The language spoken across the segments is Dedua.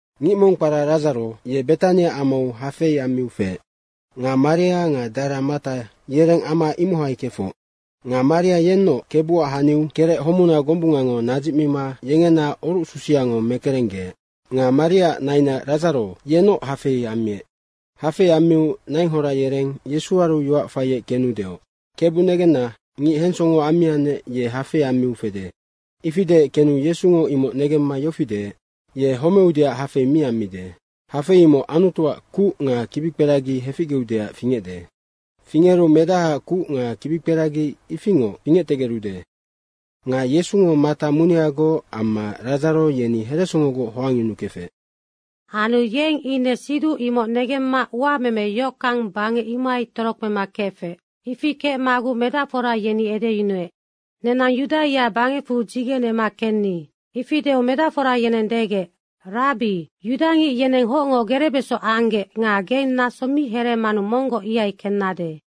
Ngic mong kpara Radzaro, ye Betania amau hafei ammiu feec. Nga Maria nga dara Mata yereng ama imohai kefoc. Nga Maria yennoc Kebuac haniu kerec homuna gombungango nadzicmima yengena orucsusiango mekerenggeec. Nga Mariaac naina Radzaro yenoc hafei ammiec. Hafei ammiu nainghora yereng Yesuaru yoac faiec kenu deoc, “Kebu negenna, ngic hensongo ammiannec, ye hafei ammiu fede.” Ifi deec kenu Yesungo imoc negemma yofi deec, “Ye homeudeac hafei mi ammide. Hafei imoc Anutuac kuc nga kibikperagi heficgeucdeac fingecde. Fingeru Medahaac kuc nga kibikperagi ifingoc fingectegerude.” Nga Yesungo Mata muneagoc amma Radzaro yeni heresongogoc hoangyunukefec. Anu yeng ine siduc imoc negemma uameme yohockang bangec ihaingoc torokpema kefec. Ifi kecmaguc medacfora yofi edeyunuec, “Nenang Yudaia bangecfu dzigenema kenni.” Ifi deu medacfora yeneng degec, “Rabbi, yudangic yeneng hocngo gerebeso anggec nga geng naso mi hereemanu monggoc ihai kennade.”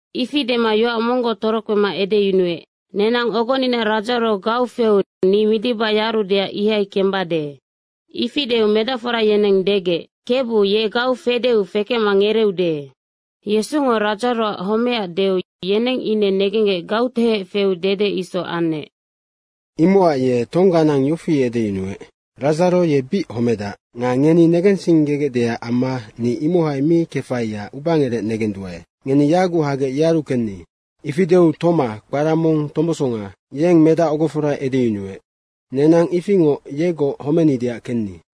Ifi dema yoac monggoc torokpema edeyunuec, “Nenang ogonina Radzaro gau feu ni midiba yarudeac ihai kembade.” Ifi deu medacfora yeneng degec, “Kebu, ye gau fedeu fekecma ngereeude.” Yesungo Radzaroac homecac deu, yeneng ine negenggec gautehec feu dede isoc anec. Imocac ye tongganang yofi edeyunuec, “Radzaro ye bic homedac.” Nga ngeni negensinggegecdeac amma ni imohai mi kefaiac ubangerec negenduae. Ngeni yaguc hagec yearu kenni. Ifi deu Toma kpara mong Tombosonga yeng medac ogofora edeyunuec, “Nenang ifingoc yegoc homenideac kenni.”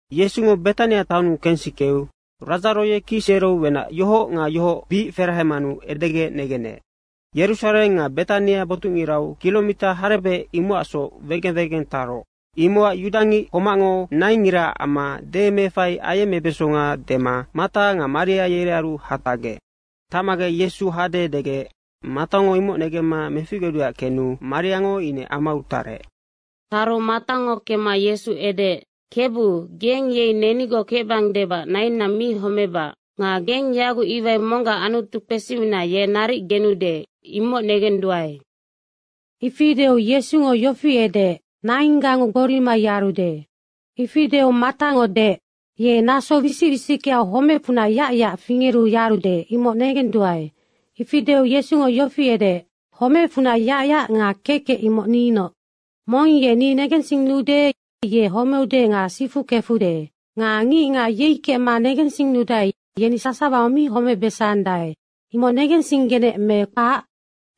Yesungo Betania taonnu kensikeu Radzaro ye kicsereu wenac yohoc nga yohoc bic ferahemanu edegec negenec. Yerusareng nga Betania botucngirau kiromita harebec, imocacsoc wegeng wegeng taroc. Imocac Yudangic homacngo naingngiraac amma demeefai ayecmebesonga dema Mata nga Maria yerearu hatacgec. Tacmagec Yesu hade degec Matango imoc negemma meficgeudeac kenu Mariango ine amau tarec. Taru Matango kemma Yesu edeec, “Kebu, geng yei nenigoc kecbang debac nainna mi homebac. Nga geng yaguc iwai monggac Anutu kpesimina ye naric genude, imoc negenduae.” Ifi deu Yesungo yofi edeec, “Nainggango gborima yarude.” Ifi deu Matango deec, “Ye naso wisic wisickeau homecfunac yacyac fingeru yarude, imoc negenduae.” Ifi deu Yesungo yofi edeec, “Homecfunac yacyac nga kekec, imoc ninoc. Mong ye ni negensinnude, ye homeude nga sifu kefude. Nga ngicngac yei kecma negensinnudae, yeni sasawango mi homebesandae, imoc negensinggenec me kpac?”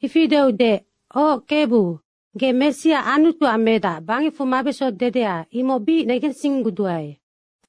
Ifi deu deec, “Oc Kebu, ge Messia Anutuac Medac bangecfu mabeso dedeanoc, imoc bic negensingguduae.”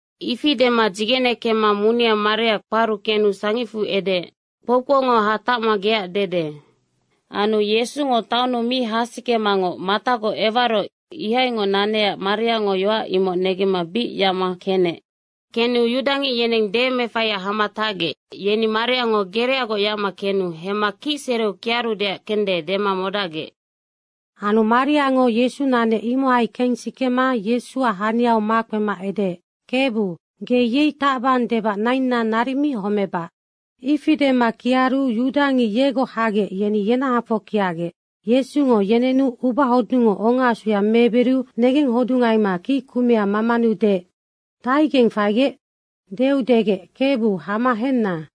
Ifi dema dzigene kemma munea Maria kparu kenu sangicfu edeec, “Kpoukpoungo hatacma geac dede.” Anu Yesungo taonnu mi hasikemangoc Matagoc ewaroc ihaingoc nanecac Mariango yoac imoc negemma bic yacma kenec. Kenu yudangic yeneng demeefaiac hama tacgec, yeni Mariango gereagoc yacma kenu hemma ye kicsereu kiarudeac kende dema modacgec. Anu Mariango Yesu nanec, imohai kensikema Yesuac haniau makpema edeec, “Kebu, ge yei tacbang debac nainna naric mi homebac.” Ifi dema kiaru yudangic yegoc hagec, yeni yenahafoc kiacgec Yesungo yenenu ubahodungngo ongaasuya meebiriu negenghodungaima kickumea mamanu deec, “Dahaigeng faigec?” deu degec, “Kebu, hama henna.”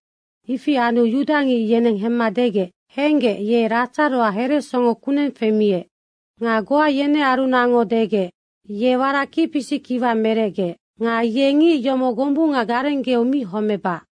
Ifi anu yudangic yeneng hemma degec, “Henggec, ye Radzaroac heresongo kuneng femiec.” Nga goa yenearunacngo degec, “Ye warac kicpisic kiwa merecgeec. Nga ye ngic yomoc gombunga garenggeu mi homebac.”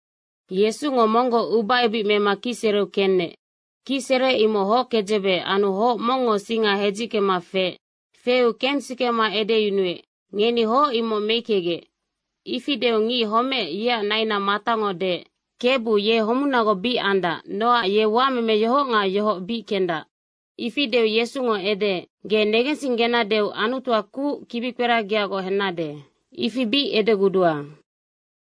Yesungo monggoc ubaebic mema kicsereu kenec. Kicsere imoc hockedzebe anu hoc mongngo singa hedzickema feec. Feu kensikema edeyunuec, “Ngeni hoc imoc meickegec.” ifi deu ngic homeec, yeac naina Matango deec, “Kebu, ye homunagoc bic andac nocac ye uameme yohoc nga yohoc bic kendac.” Ifi deu Yesungo edeec, “Ge negensinggenadeu Anutuac kuc kibikperagiagoc hennade, ifi bic edegudua.”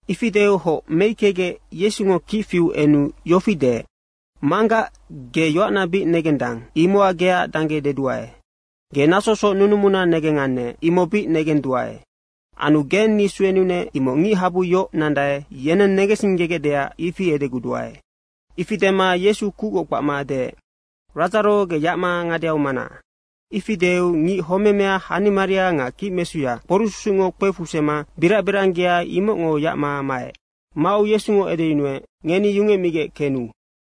Ifi deu hoc meickegec Yesungo kic fiu enu yofi deec, “Manggac, ge yoacna bic negendang, imocac geac dangge deduae. Ge nasosoc nunumuna negengannec, imoc bic negendua. Anu geng ni suenunec, imoc ngichabu yoc nandae, yeneng negensinggegecdeac ifi edegudua.” Ifi dema Yesungo kucgoc kpacma deec, “Radzaro, ge yacma ngadeau mana.” Ifi deu ngic homemea hanimaria nga kicmesuya kporucsusucngo kpefusema birac biranggea, imocngo yacma maec. Mau Yesungo edeyunuec, “Ngeni yungecmigec kenu.”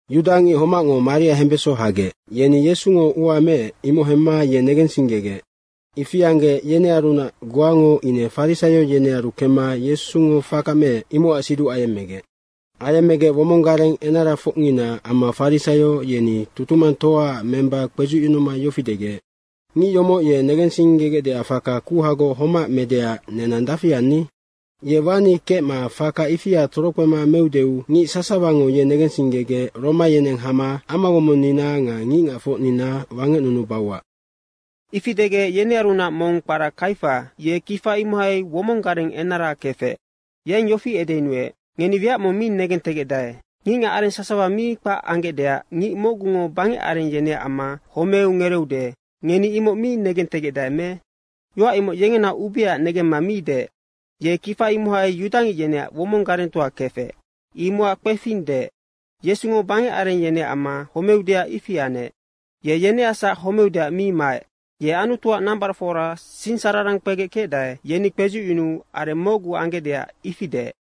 Yudangic homacngo Maria hembeso hagec, yeni Yesungo ua meec, imoc hemma ye negensinggegec. Ifi anggec, yenearunac goango ine farisaio yenearu kemma Yesungo faka meec, imocac siduc ayemmegec. Ayemmegec womong gareng enarafocngina amma farisaio, yeni tutumangtoaac memba kpedzucyunuma yofi degec, “Ngic yomoc ye negensinggegecdeac faka kuhagoc homac medeac nenang dafi anni? Ye wani kecma faka ifia torokpema meudeu ngic sasawango ye negensinggegec Roma yeneng hama amawomonnina nga ngicngacfocnina wangecnunubauac.” Ifi degec, yenearunac mong kpara Kaifa, ye kifa imohai womong gareng enara kefec, yeng yofi edeyunuec, “Ngeni wiac mong mi negentegecdae. Ngicngac areng sasawa mi kpac anggecdeac ngic mocgungo bangec areng yeneac amma homeu ngereeude, ngeni imoc mi negentegecdae me?” Yoac imoc yengena ubeaac negemma mi deec. Yeng kifa imohai yudangic yeneac womong garengtoa kefec, imocac kpefing deec. Yesungo bangec areng yeneac amma homeudeac ifi anec. Ye yeneacsac homeudeac mi maec. Ye Anutuac nambaracfora sinsararang kpegec kecdae, yeni kpedzucyunuu areng mocgu anggecdeac ifi deec.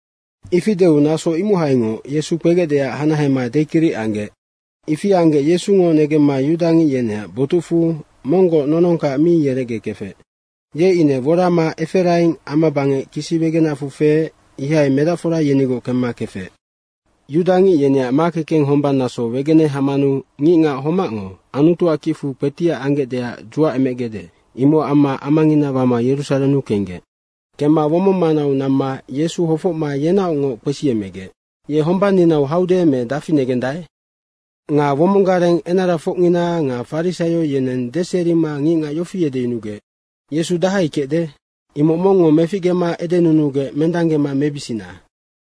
Ifi deu naso imohaingoc Yesu kpegecdeac hanahema dekiric anggec. Ifi anggec Yesungo negemma yudangic yeneac botucfu monggoc nonongkac mi yerecgekefec. Ye ine worama Eferaing ama bangec kisi wegenacfu feec, ihai medacfora yenigoc kemma kefec. Yudangic yeneac makekeng hombang naso wegene hamanu ngicngac homacngo Anutuac kicfu kpetiac anggecdeac dzuacemegecde, imocac amma amangina wama Yerusarennu kenggec. Kemma womong manau namma Yesu hofocma yenaocngoc kpesiemegec, “Ye hombanninau haude me dafi negendae?” Nga womong gareng enarafocngina nga farisaio yeneng deserima ngicngac yofi edeyunugec, “Yesu dahai kecde, imoc mongngo meficgema edenunugec mendanggema mebisina.”